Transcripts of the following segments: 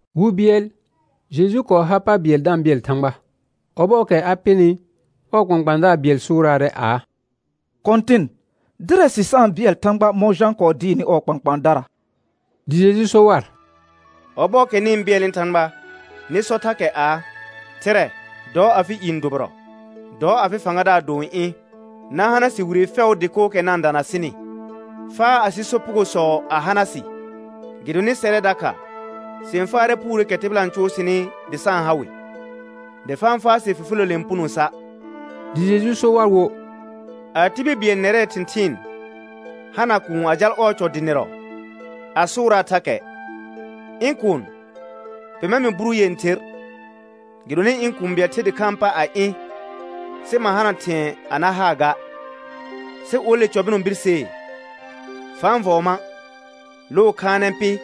Wi bɩɛl Jeju kɔɔ har pa bɩɛl da-n bɩɛl Thãgba. Ɔbɔɔkɛ a pɩnɩ, ɔɔ kpãkpãadaar bɩɛl sʋʋraarɛ aa: Kɔ̃tɩn, dɩrɛ sɩ sa-n bɩɛl Thãgba mɔ̃ Jã kɔɔ dɩɩrnɩ ɔɔ kpãkpãadara. Dɩ Jeju so war: Ɔbɔɔkɛ nɩ-n bɩɛlnɩ Thãgba nɩ sɔ thakɛ aa: Thɩrɛ, dɔ afɩ i n dʋbɩrɔ, dɔ afɩ fãgadaar do n ɩ̃. Na hana sɩ wire fɛʋʋ dɩkookɛ na-n dana sɩnɩ. Faa asɩ sopugosɔ a hana sɩ, gɩdonɩ sɛrɛ dakha sɩ-n faarɛ puureekɛ tɩbɩla n cʋʋ sɩnɩ dɩ sa-n ha wɩ. Dɩ fa-n faa sɩ fifiləle n puno sa'. Dɩ Jeju so war wo: A tibil bɩɛl nɛrɛɛ thɩ̃thɩɩn hana kuun a jal ɔɔ cɔ dɩnɩrɔ a sʋʋraa thakɛ: Ɩ̃ kuun, pema mɩ buru yẽther, gɩdonɩ ɩ̃ kũu bɩɛl ther dɩkhãa pa a ɩ̃, sɩ ma hana thɩ̃ɛ a na haa ga. Sɩ ole cɔ bɩnɔ birsee: Fa-n vɔɔ ma', loo khaanɛ pɩ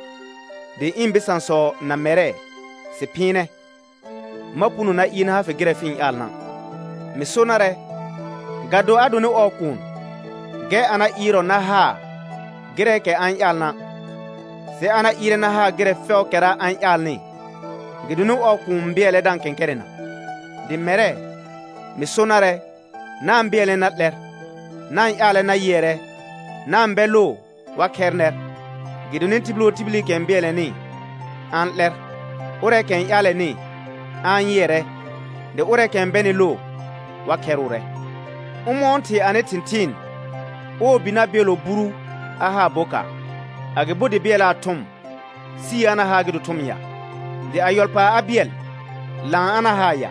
dɩ ɩ̃ bɩsãsɔ na mɛrɛ sɩ phɩɩnɛ, ma puno na ɩɩr na ha fɩ gɩrɛ fɩ-n ƴaalna'. Mɩ so narɛ, ga do a donɩ ɔɔ kuun, gɛr a na ɩɩrɔ na haa gɩrɛɛkɛ a-n ƴaalna', sɩ a na ɩɩrɛ na haa gɩrɛ fɛʋʋkɛra a-n ƴaalnɩ, gɩdonɩ ɔɔ kuun bɩɛlɛ da-n kɛ̃kɛrɛna. Dɩ mɛrɛ, mɩ so narɛ: Na-n bɩɛlnɛ na 'lɛr, na-n ƴaalɛ na yɩɛrɛ, na-n bɛ loo wa khɛr nɛr. Gɩdonɩ tibil wo tibilikɛ n bɩɛlnɛnɩ a-n 'lɛr, ʋrɛɛkɛ n ƴaalɛnɩ a-n yɩɛrɛ, dɩ ʋrɛɛkɛ n bɛnɩ loo wa khɛrʋʋrɛ. Ʋmɔ̃ɔ thɩ anɩ thɩ̃thɩɩn ɔɔ bi na bɩɛllɔ buru a haa bokaar? Agɩbo dɩ bɩɛlaa thʋm, sii a na haa gɩ do thʋm ya? Dɩ a yɔl paar a bɩɛl, laan a na haa ya?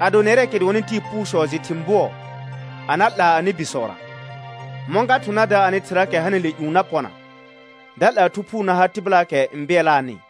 Ado nɛrɛɛkɛ dʋɔnnɩ tɩɩ puusɔ jɩ thɩ̃ bʋɔ a na 'laa anɩ bisɔra, mɔ̃ ga thʋ̃ na da anɩ Thɩraakɛ hanɩle ƴũ na pɔna, da 'laa Thu Phuu na ha tɩbɩlaakɛ n bɩɛlaanɩ?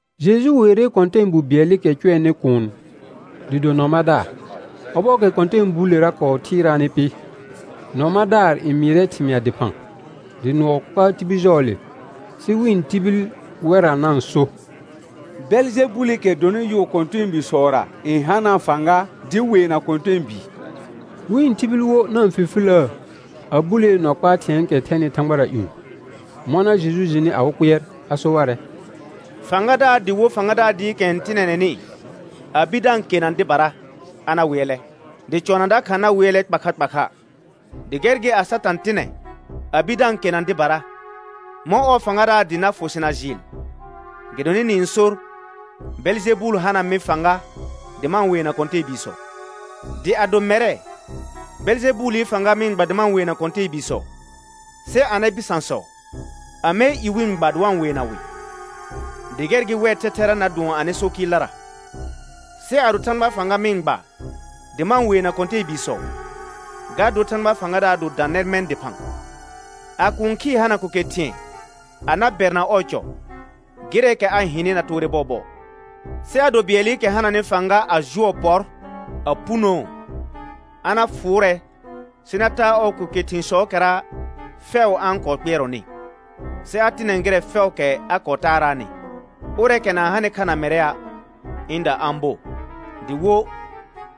Jeju weere kɔ̃tɛɛbu bɩɛlɩkɛ cʋɛnɩ kuun dɩ do nɔ madaar. Ɔbɔɔkɛ kɔ̃tɛɛbuulera kɔɔ thɩɩraanɩ pɩ, nɔ madaar n mɩɩrɛ thɩmɩa dɩphã, dɩ nʋɔ kpaa tibil jɔɔle. Sɩ wɩ̃ tibil wɛrra na-n so: Bɛljɛbulikɛ dɔnɩ yʋʋ kɔ̃tɛɛbiisɔra n hanaa fãga dɩ weena kɔ̃tɛɛbii. Wɩ̃ tibil wo na-n fifiləə a bulee nɔ kpaa thɩ̃ɛɛkɛ thɛnɩ thãgbara ƴũ. Mɔna Jeju jɩnɩ awɩ kpɩɛr a so warɛ: Fãgadaar dɩ wo fãgadaar dɩɩkɛ n tɩnɛnɛnɩ a bir da-n kena dɩbara a na wɩɛlɛ, dɩ cɔna dakha na wɩɛlɛ kpa kha kpa kha. Dɩ gɛr gɩ, a Satã tɩnɛ a bir da-n kena dɩbara, mɔ̃ ɔɔ fãgadaar dɩ na fʋ sɩ na jɩɩl, gɩdonɩ nɩ-n sor: Bɛljɛbul hana mɩ fãga dɩ ma-n weena kɔ̃tɛɛbiisɔ? Dɩ ado mɛrɛ, Bɛljɛbuli fãga mɩ-n gba dɩ ma-n weena kɔ̃tɛɛbiisɔ, sɩ anɩ bɩsãsɔ amɛɛ i wɩ-n gba dɩ wa-n weena wɩ? Dɩ gɛr gɩ wɛr thɛthɛra na dʋɔn anɩ so kɩɩldara. Sɩ ado Thãgbaa fãga mɩ-n gba dɩ ma-n weena kɔ̃tɛɛbiisɔ, ga dor Thãgbaa fãgadaar do dã nɛr mɛ̃ dɩphã. A kũu khɩɩ hana ko ke thɩ̃ɛ a na bɛrna ɔɔ cɔ, gɩrɛɛkɛ a hɩnɩ na toore bɔɔbɔɔ. Sɩ ado bɩɛlɩkɛ hananɩ fãga a jʋɔ pɔr a punoo, a na fʋʋrɛ sɩ na taa ɔɔ ko ke thɩ̃sɔɔkɛra fɛʋ a-n kɔɔ kpɩɛrɔnɩ, sɩ a tɩnɛ gɩrɛ fɛʋʋkɛ a kɔɔ taaraanɩ. Ʋrɛɛkɛ na-n hanɩ kha na mɛrɛa', ɩ̃da a-n bo; dɩ wo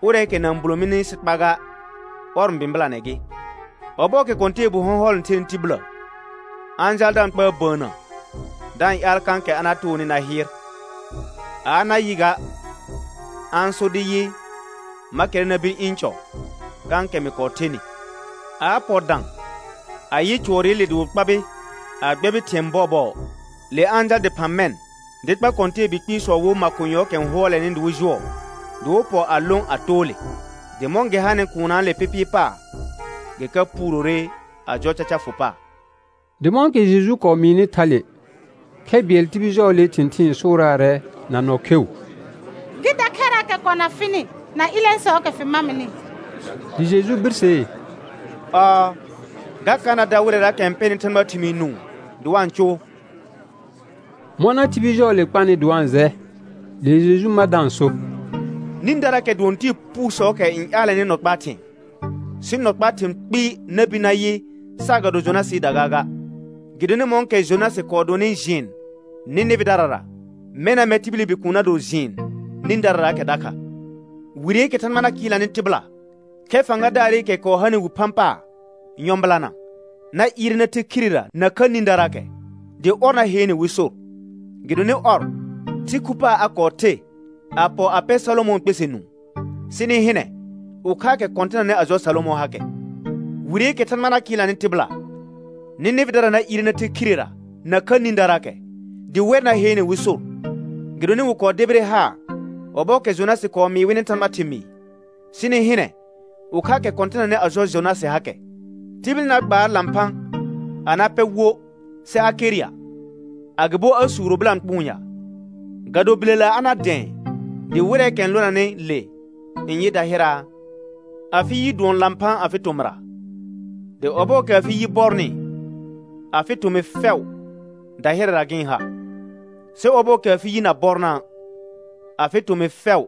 ʋrɛɛkɛ na-n bulo mini sɩ kpa ga, ɔr n bɩ̃bɩlanɛ gɩ. Ɔbɔɔkɛ kɔ̃tɛɛbu hɔ̃hɔl n thenɩ tibillə, a-n jaal da-n kpaar bəənnə da-n ƴaal kãkɛ a na toonɩ na hɩɩr. A a na yɩ ga, a-n sor dɩ yɩ: Ma kɛrrɛ na bir ɩ̃ cɔ kãkɛ mɩ kɔɔ thenɩ. A a pɔ dã a yɩ cʋɔrɩle dɩ wɩ kpabɩ a gbɛbɩrɩ thɩ̃ɛ bɔɔbɔɔ; le a-n jal dɩphã mɛ̃ dɩ kpa kɔ̃tɛɛbi kpɩɩsɔ wo makonyɔɔkɛ n hʋɔlɛnɩ dɩ wɩ jʋɔ, dɩ wɩ pɔ a lõ a too le. Dɩ mɔ̃ gɩ hanɩ kuunnaale pɩpɩɩ paar, gɩ ka puurore a jɔ caca fʋ paar. Dɩ mɔ̃kɛ Jeju kɔɔ mɩɩnɩ thale, khɛ bɩɛl tibil jɔɔlee thɩ̃thɩɩn sʋʋraarɛ na nɔ kheu: Gɩ da khɛrraakɛ kɔna fɩnɩ na ɩlɛ̃sɔɔkɛ fɩ mamɩnɩ. Dɩ Jeju birsee: Ɔɔ, ga ka na dar wɩrɛraakɛ n pɛnɩ Thãgbaa thɩmɩɩ nũu dɩ wa-n cʋʋ. Mɔna tibil jɔɔle kpanɩ dɩ wa-n jɛ, le Jeju ma da-n so: Nĩdaraakɛ dʋɔn tɩɩ puusɔɔkɛ n ƴaalɛnɩ nɔ kpaa thɩ̃ɛ. Sɩ nɔ kpaa thɩ̃ kpɩɩ na bir na yɩ saagado Jonasɩɩda gaaga. Gɩdonɩ mɔ̃kɛ Jonasɩ kɔɔ donɩ jɩɩn Nɩnɩvɩdarara, mɛna mɛr tibili Bikuun na do jɩɩn nĩdararaakɛ dakha. Wireekɛ Thãgba na kɩɩlnanɩ tɩbɩla, khɛr fãgadaarɩkɛ kɔɔ hanɩ wi phã paar nyɔ̃bɩlana, na ɩɩrɛ na the khirera nakha nĩdaraakɛ, dɩ ɔr na heene wɩ sor. Gɩdonɩ ɔr, thɩ khu paar a kɔɔ the a pɔ a pɛ Salomɔ̃ɔ kpɛsɛ nũu. Sɩ nɩ hɩnɛ, ʋkhaakɛ kɔ̃tɩnanɩ a jɔ Salomɔ̃ hakɛ. Wireekɛ Thãgba na kɩɩlnanɩ tɩbɩla, Nɩnɩvɩdara na ɩɩrɛ na the khirera nakha nĩdaraakɛ, dɩ wɛr na heene wɩ sor, gɩdonɩ wɩ kɔɔ debire haar ɔbɔɔkɛ Jonasɩ kɔɔ mɩɩ wɩnɩ Thãgbaa thɩmɩɩ. Sɩ nɩ hɩnɛ, ʋkhaakɛ kɔ̃tɩnanɩ a jɔ Jonasɩ hakɛ. Tibil na gbaar lãphã a na pɛ wo sɩ a ker ya, agɩbo a suuro bɩlãkpʋʋn ya? Ga do bilela a na dɛ̃ɛ dɩ wɩrɛɛkɛ n lonanɩ le n yɩ dahɩraa? Afɩ yi dʋɔn lãphã afɩ tomɩra, dɩ ɔbɔɔkɛ afɩ yi bɔrnɩ, afɩ tomɩ fɛʋ dahɩrɛra gɩ-n ha. Sɩ ɔbɔɔkɛ afɩ yi na bɔrna', afɩ tomɩ fɛʋ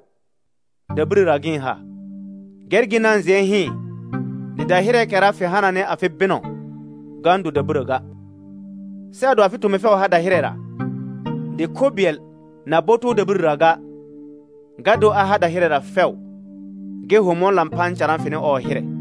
dabirəra gɩ-n ha. Gɛr gɩ na jɩɛ hɩɩn dɩ dahɩrɛɛkɛra fɩ hananɩ afɩ bɩnɔ, ga-n do dabirə ga. Sɩ ado afɩ tomɩ fɛʋ har dahɩrɛra, dɩ kho bɩɛl na bo too dabirəra ga, ga dor a har dahɩrɛra fɛʋ gɩ ho mɔ̃ lãphã n carã fɩnɩ ɔɔ hɩrɛ.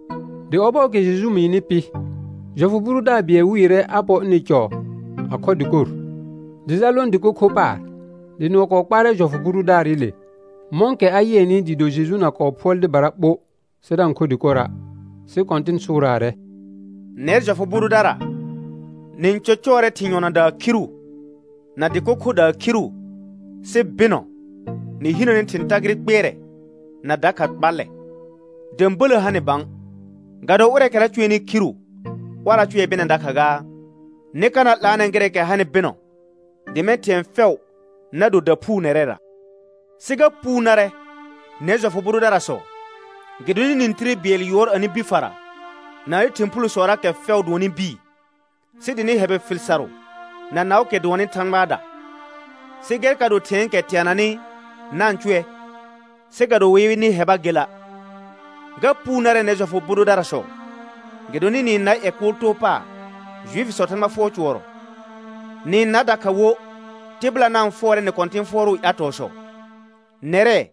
Dɩ ɔbɔɔkɛ Jeju mɩɩnɩ pɩ, jɔfʋ bʋ dʋdaar bɩɛl wɩɩrɛ a pɔ ɩnɩ cɔ a khɔ dɩkor. Dɩ jal lõ dɩko kho paar. Dɩ nʋɔ kɔɔ kpaarɛ jɔfʋ bʋ dʋdaarɩle, mɔ̃kɛ a yɩɛnɩ dɩɩ do Jeju na kɔɔ phʋɔl dɩbara ɓo sɩ da-n kho dɩkora'. Sɩ Kɔ̃tɩn sʋʋraarɛ: Nɛr jɔfʋ bʋ dʋdara, nɩ-n cɔcɔɔrɛ thɩ̃ yɔdaa khiru na dɩko khodaa khiru, sɩ bɩnɔ nɩ hinəne thɩ̃ tagɩrɩ kpɩɛrɛ na dakha kpallɛ. Də̃bələ ha nɩ bã, ga do ʋrɛɛkɛra cʋɛnɩ khiru, ɔrra cʋɛ bɩnɛ dakha gaa? Nɩ ka na 'laanɛ gɩrɛɛkɛ hanɩ bɩnɔ, dɩ mɛ̃ thɩ̃ɛ fɛʋ na do daphuu nɛrɛra. Sɩ ga puu narɛ nɛr jɔfʋ bʋ dʋdarasɔ, gɩdonɩ nɩ-n tire bɩɛl yʋɔr anɩ bi fara na anɩ thɩ̃ phulosɔraakɛ fɛʋ dʋɔnnɩ bii. Sɩ dɩ nɩ hɛbɩ fɩl sarʋ na naʋʋkɛ dʋɔnnɩ Thãgbaada. Sɩ gɛr ka do thɩ̃ɛɛkɛ teananɩ na-n cʋɛ, sɩ ga do wɩ yɩ nɩ hɛba gela'. Ga puu narɛ nɛr jɔfʋ bʋ dʋdarasɔ, gɩdonɩ nɩ-n nar ƴɛ kʋʋl too paar Juifisɔɔ Thãgba fʋɔr cʋɔrɔ. Nɩ-n nar dakha wo tɩbɩla na-n fʋɔrɛ nɩ kɔ̃tɩ̃ fʋɔrʋʋ ƴatɔɔsɔ. Nɛrɛ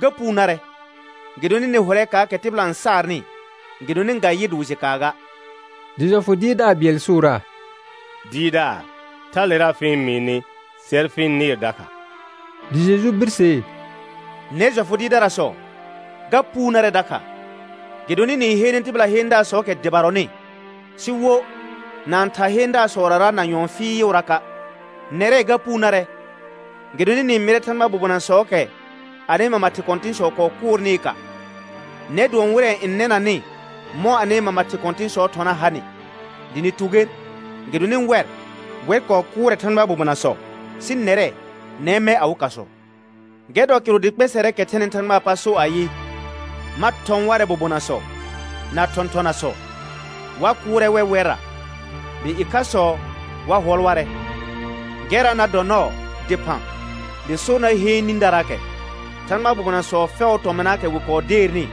ga puu narɛ, gɩdonɩ nɩ hʋrɛ kaakɛ tɩbɩla n saarnɩ, gɩdonɩ ga yɩr dɩ wɩ jɩ kaa ga. Dɩ jɔfʋ dɩɩrdaar bɩɛl sʋʋraa: Dɩɩrdaar, thalera fɩ-n mɩɩnɩ, sɛr fɩ-n nɩɩr dakha. Dɩ Jeju birsee: Nɛr jɔfʋ dɩɩrdarasɔ ga puu narɛ dakha, gɩdonɩ nɩ-n heene tɩbɩla heendaasɔɔkɛ dɩbarɔnɩ, sɩ wo na-n thar heendaasɔrara na nyɔ̃ɔ fɩɩʋraka'. Nɛrɛ ga puu narɛ, gɩdonɩ nɩ-n mɩrɛ Thãgbaa bobonasɔɔkɛ anɩ mama thɩ kɔ̃tɩ̃sɔ kɔɔ kʋʋrnɩɩ ka. Nɛr dʋɔn wɩrɛ n nɛnanɩ mɔ̃ anɩ mama thɩ kɔ̃tɩ̃sɔɔ thɔna hanɩ, dɩ nɩ tu ger gɩdonɩ wɛr, wɛr kɔɔ kʋʋrɛ Thãgbaa bobonasɔ. Sɩ nɛrɛ, nɛr n mɛ awɩ kasɔ. Gɛr dɔ kɩrʋ dɩ kpɛsɛrɛɛkɛ thɛnɩ Thãgbaa pa so ayɩ: Ma thɔ̃ warɛ bobonasɔ na thɔ̃thɔnasɔ. Wa kʋʋrɛ wɛ wɛrra, dɩ ɩkhasɔ wa hʋɔl warɛ. Gɛrra na dɔ nɔɔ dɩphã dɩ sor na heen nĩdaraakɛ Thãgbaa bobonasɔ fɛʋʋ tɔmɩnaakɛ wɩ kɔɔ deernɩ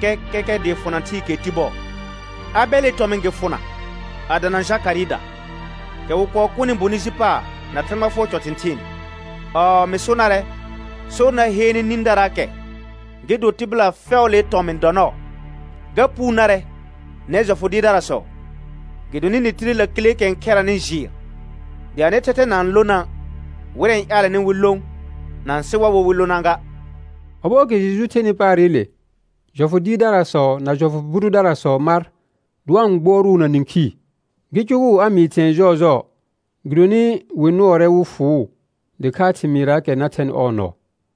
kɛkɛkɛ dɩɩ fʋna thɩɩkɛɛ ti bɔɔ, Abɛlɩ tɔmɩ̃ gɩ fʋna a dana Jakarɩɩda, kɛ wɩ kɔɔ kʋnɩ bonɩ ji paar na Thãgba fʋɔr cɔ thɩ̃thɩɩn. Ɔɔ mɩ so narɛ, sor na heene nĩdaraakɛ gɩ do tɩbɩla fɛʋʋlee tɔmɩ̃ dɔ nɔɔ. Ga puu narɛ nɛr jɔfʋ dɩɩrdarasɔ, gɩdonɩ nɩ tire lakileekɛ n khɛranɩ jɩɩr, dɩ anɩ thɛthɛ na-n lona', wɩrɛ n ƴaalɛnɩ wɩ lõ na-n sɩ war wo wɩ lona ga. Ɔbɔɔkɛ Jeju thenɩ paarɩle, jɔfʋ dɩɩrdarasɔ na jɔfʋ bʋ dʋdarasɔ mar dɩ wa-n gbʋɔrʋʋ na nĩkhii, gɩ cʋgʋʋ a mɩɩ thɩ̃ɛ jɔɔjɔɔ; gɩdonɩ wɩ nʋɔrɛ wɩ fʋʋ dɩkhaa thɩmɩɩraakɛ na thɛnɩ ɔɔ nɔɔ.